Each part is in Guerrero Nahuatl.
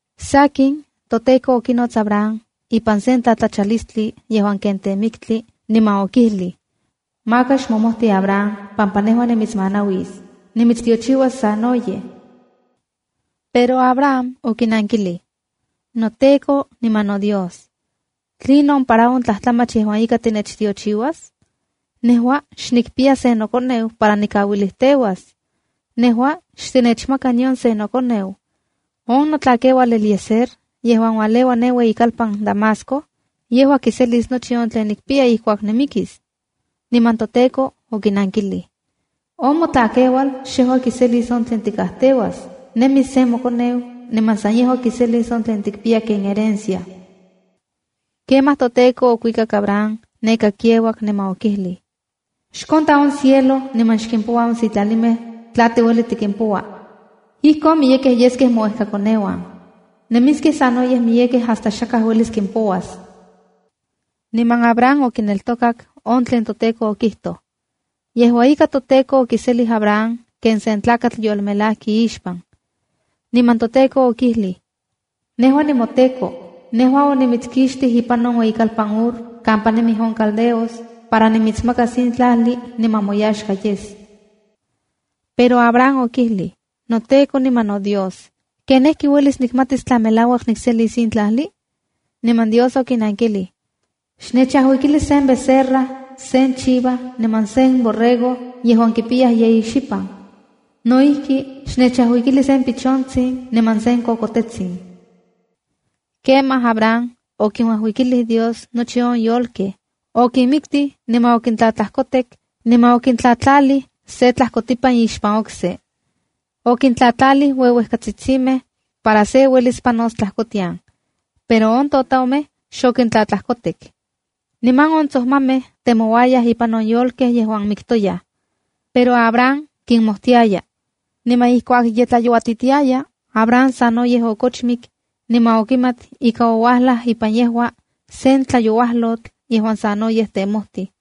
Sakin, toTEKO okinots Abram ipan sen tlatlachalistli yejuan ken temiktli, niman okijlij: —Maka xmomojti Abram, pampa nejua nimitsmanauisa. Nimitstiochiuas sanoyej. Pero Abram okinankilij: —NoTEKO niman noDios, ¿Tlinon para on tlajtlamach yejuan ika tinechtiochiuas? Nejua xnikpiya sen nokoneu para nikauilijteuas. Nejua xtinechmaka nion se nokoneu. On notlakeual Eliezer yejuan ualeua ne ueyikalpan Damasco, yejua kiselis nochi on tlen nikpiya ijkuak nimikis. Niman toTEKO okinankilij: —On motlakeual xejua kiselis on tlen tikajteuas. Nemis se mokoneu niman san yejua kiselis on tlen tikpiya ken herencia. Kemaj toTEKO okuikak Abram neka kiauak niman okijlij: —Xkonta on cielo niman xkimpoua on sitlalimej tla tiueli tikimpoua. Ijkon miyekej yeskej mouejkakoneuan. Nemiskej sanoyej miyekej hasta xakaj uelis kimpouas. Niman Abram okineltokak on tlen toTEKO okijtoj. Yejua ika, toTEKO okikiselij Abram ken sen tlakatl yolmelajki ixpan. Niman toTEKO okijlij: —Nejua nimoTEKO. Nejua onimitskixtij ne ipan on ueyikalpan Ur kampa nemij on caldeos, para nimitsmakas in tlajli niman moyaxka yes. Pero Abram okijlij: —NoTEKO niman noDios, ¿ken ijki uelis nikmatis tla melauak nikselis in tlajli? Niman Dios okinankilij: —Xnechajuikili sen becerra, sen chiva niman sen carnero yejuan kipiyaj yeyi xipan. No ijki, xnechajuikili se pichontsin niman se kokotetsin. Kemaj Abram okinuajuikilij Dios nochi on yolkej. Okinmiktij niman okintlatlajkotek, niman okintlatlalij se tlajkotipan ixpan okse. Okintlajtlalij ueuejkatsitsimej para se uelis panos tlajkotian. Pero on totomej xokintlatlajkotek. Niman on tsojmamej temouayaj ipan on yolkej yejuan miktoyaj, pero Abram kinmojtiaya. Niman ijkuak ye tlayouatitiaya, Abram sanoyej okochmik niman okimat ika oualaj ipan yejua, sen tlayouajlotl yejuan sanoyej temojtij.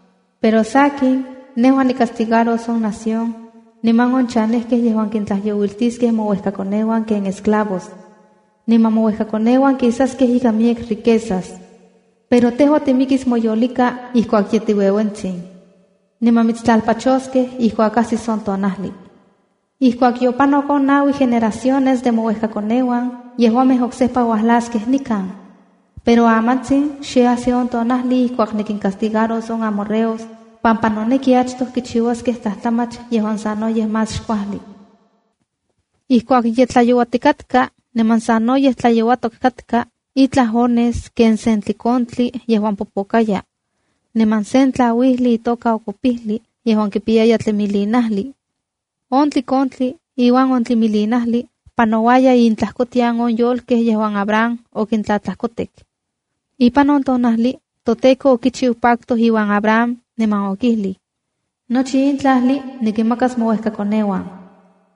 Pero sakin, nejua nicastigaros on nación niman on chanejkej yejuan kintlajyouitiskej mouejkakoneuan ken esclavos. Niman mouejkakoneuan kisaskej ikan miyek riquezas. Pero tejua timikis moyolika ijkuak ye tiueuentsin. Niman mitstlalpachoskej ijkuak ajsis on tonajli. Ijkuak yopanok on naui generaciones de mouejkakoneuan, yejuamej oksejpa uajlaskej nikan. Pero amantsin xe ajsi on tonajli ijkuak nikincastigaros on amorreos pampa noneki achtoj kichiuaskej tlajtlamach yejuan sanoyej más xkuali. Ijkuak ye tlayouakatka niman sanoyej tlayouatok katka, itlaj ones ken sen tlikontli yejuan popokaya, niman sen tlauijli itoka okopijli yejuan kipiyaya tlimilinajli. On tlikontli iuan on tlimilinajli panouayaj intlajkotian on yolkej yejuan Abram okintlatlajkotek. Ipan on tonajli, toTEKO okichiu pacto iuan Abram niman okijlij: —Nochi in tlajli nikinmakas mouejkakoneuan.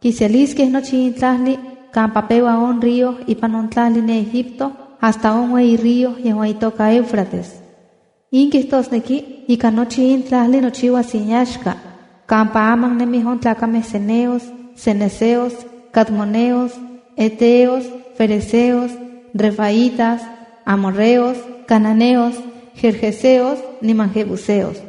Kiseliskej nochi in tlajli kampa peua on río ipan on tlajli ne Egipto hasta on ueyi río yejuan itoka Éufrates. In kijtosneki ika nochi in tlajli nochiuas inyaxka kampa aman nemij on tlakamej ceneos, cenezeos, cadmoneos, heteos, ferezeos, refaitas, amorreos, cananeos, gergeseos niman jebuseos.